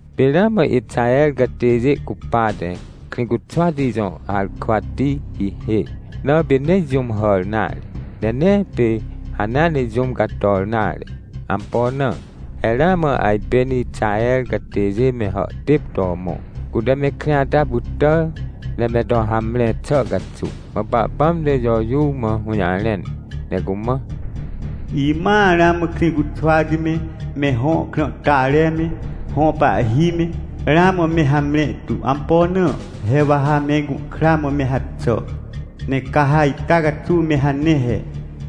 Pê ramã Ixaher catêjê cupate, Krĩcuxwati jõ harkwati hihê, na pê nee jũm hàr nare, ne nee pê hanea nejũm cator nare. Ampo na? He ramã ajpên Ixahercatêjê me hàhtêp to mõ, cute me krĩ ata pytàr, ne me to hamre xàcaxuw. Mã Pahpãm te Jojuw mã hũjarẽn, ne cumã: — Imãa ramã Krĩcuxwati me, me hõ krãhtare me, hõ pahhi me, ramã mehamre tu. Ampo na? He wa ha me gũhkra mã me haxà. — Ne ca ha ita caxuw me hane he.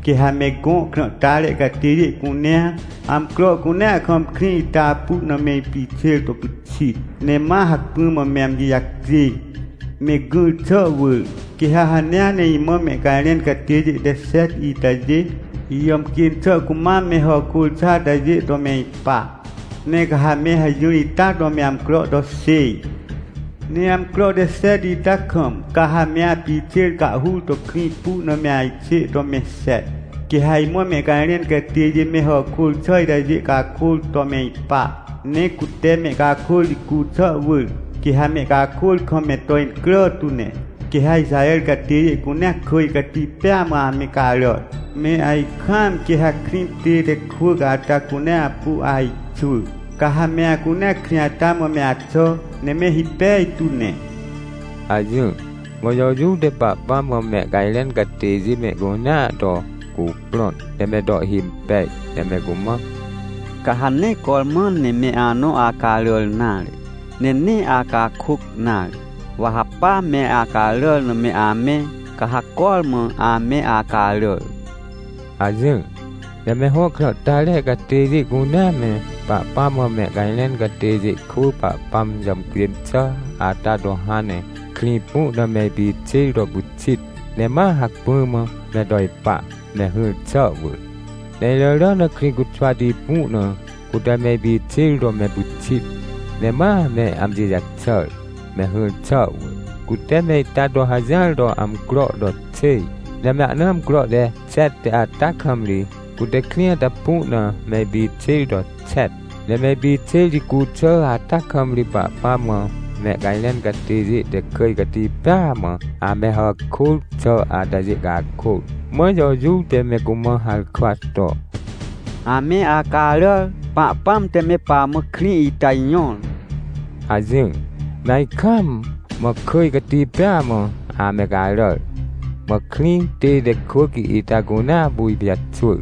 Quê ha me gõ krãhtare catêjê cunea, amcro cunea kam krĩ itapu na me ipixêr to pyxit, ne ma hacpỹ mã me amji jacjê, me gỹr xà wỳr. Quê ha hanea ne imã mehcajrẽn catêjê te xet itajê, ijàmcjên xà cumam mehàkôr xà atajê to me ipa. Ne ca ha me hajỹr ita to me amcro to xêj. — Ne amcro te xet ita kam, ca ha me apixêr cahhur to krĩ pu na me ajxê to mexet. Quê ha imã mehcajrẽn catêjê me hàkôr xà itajê cakôr tome ipa, ne cute mehcakôr jicu xà wỳr, quê ha mehcakôr kam me to incrà tune, quê ha Ixaher catêjê cunea kỳj cati pêa mã ame caràr. Me ajkaamquê ha krĩ tête kwỳc ata cunea apu ajxwỳ. Ca ha me acunea krĩ ata mãme axà, ne me hipej tu ne — hajỹr. Mã Jojuw te Pahpãm mã mehcajrẽn catêjê me mehcunea to cuprõn, ne me to ihhimpej, ne me cumã: — Ca ha nee cormã ne me anõ acaràr nare, ne nee acakôc nare. Wa ha pame acaràr na me amẽ, ca ha cormã ame acaràr — hajỹr. Ne me hõ krãhtare catêjê cunea me, Pahpãm mãmehcajrẽn catêjê kwỳ Pahpãm jàmcjên xà ata to hãn ne krĩ pu na meipixêr to pyxit, ne ma hacpỹ mã me to ipa, me hỹr xà wỳr. Ne iràràna Krĩcuxwati pu na cute me ipixêr to me pyxit, ne mame amji jaxàr, me hỹr xà wỳr. Cute me ita to hajỹar toamcro to xêj. Ne me ahna amcro te xet ata kam ri, cutekrĩ ata pu na me ipixêr to xet. Ne me ipixêr jicu xàata kam ri Pahpãm mã mehcajrẽn catêjê te kỳj cati pêa mã amehàkôr xà atajê cakôr. Mã Jojuw te me cumã harkwa to: — Ame acaràr! Pahpãm te me pamã krĩ ita jõr! — hajỹr. Me ajkaam, mãkỳj cati pêa mã ame caràr, mã krĩ tête kwỳc ita cunea apuipijaxwỳr,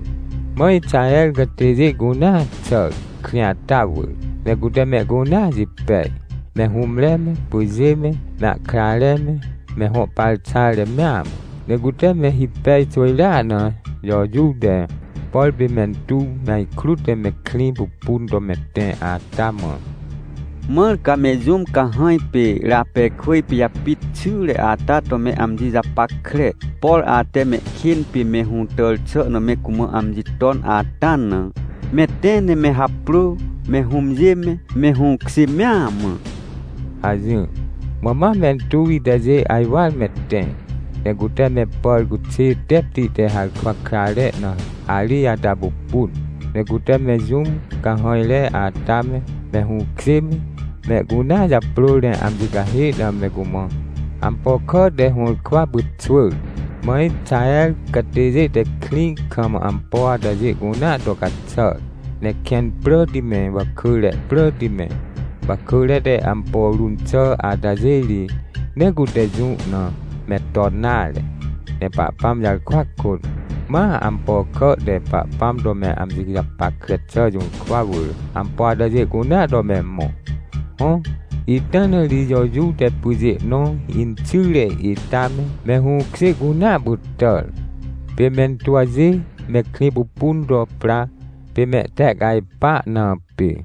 mã Ixaher catêjê cunea xàr, krĩ ata wỳr. Ne cute mehcunea jipej, me hũmre me, pyjê me, me ahkrare me, me hõ parxare mea mã. Ne cute me hipej xwỳjrea na Jojuw te, por pê mentuw me ajkrut ne me krĩ pupun to me tẽ ata mã: — Mãr ca me jũm cahãj pê Rapekwỳj pijapit xyre ata to me amji japackre, porate mehkên pê me hũtàr xà na me cumã amji tonata na. Me tẽ ne me haprô, me hũmjê me, mehũkjê mea mã — hajỹr. Mã ma mentuw itajê ajwar me tẽ, ne cute me pàr cuxê tepti te harkwa krare na harij ata pupun, ne cute me jũmcahãjre ata me, me hũkjê me, mehcunea japrôr ne amji cahê na me cumãampo kà te hũrkwa pyxwỳr. Mã Ixaher catêjê te krĩ kam ampo atajê cunea to caxàr, ne kẽn pràtime, wakỳre pràti me, wakỳre te ampo run xà atajê ri, nee cute jũ name ton nare, ne Pahpãm jarkwa kôt, ma ampo kà te Pahpãm to me amji japackre xà jũrkwawỳr, ampo atajê cunea to me mõ. Hõ, ita na ri Jojuw te pyjê nõ inxyre ita me, me hũkjê cunea pytàr, pê mentuwjê me krĩ pupun to pra, pê mehtehcajpa na pê.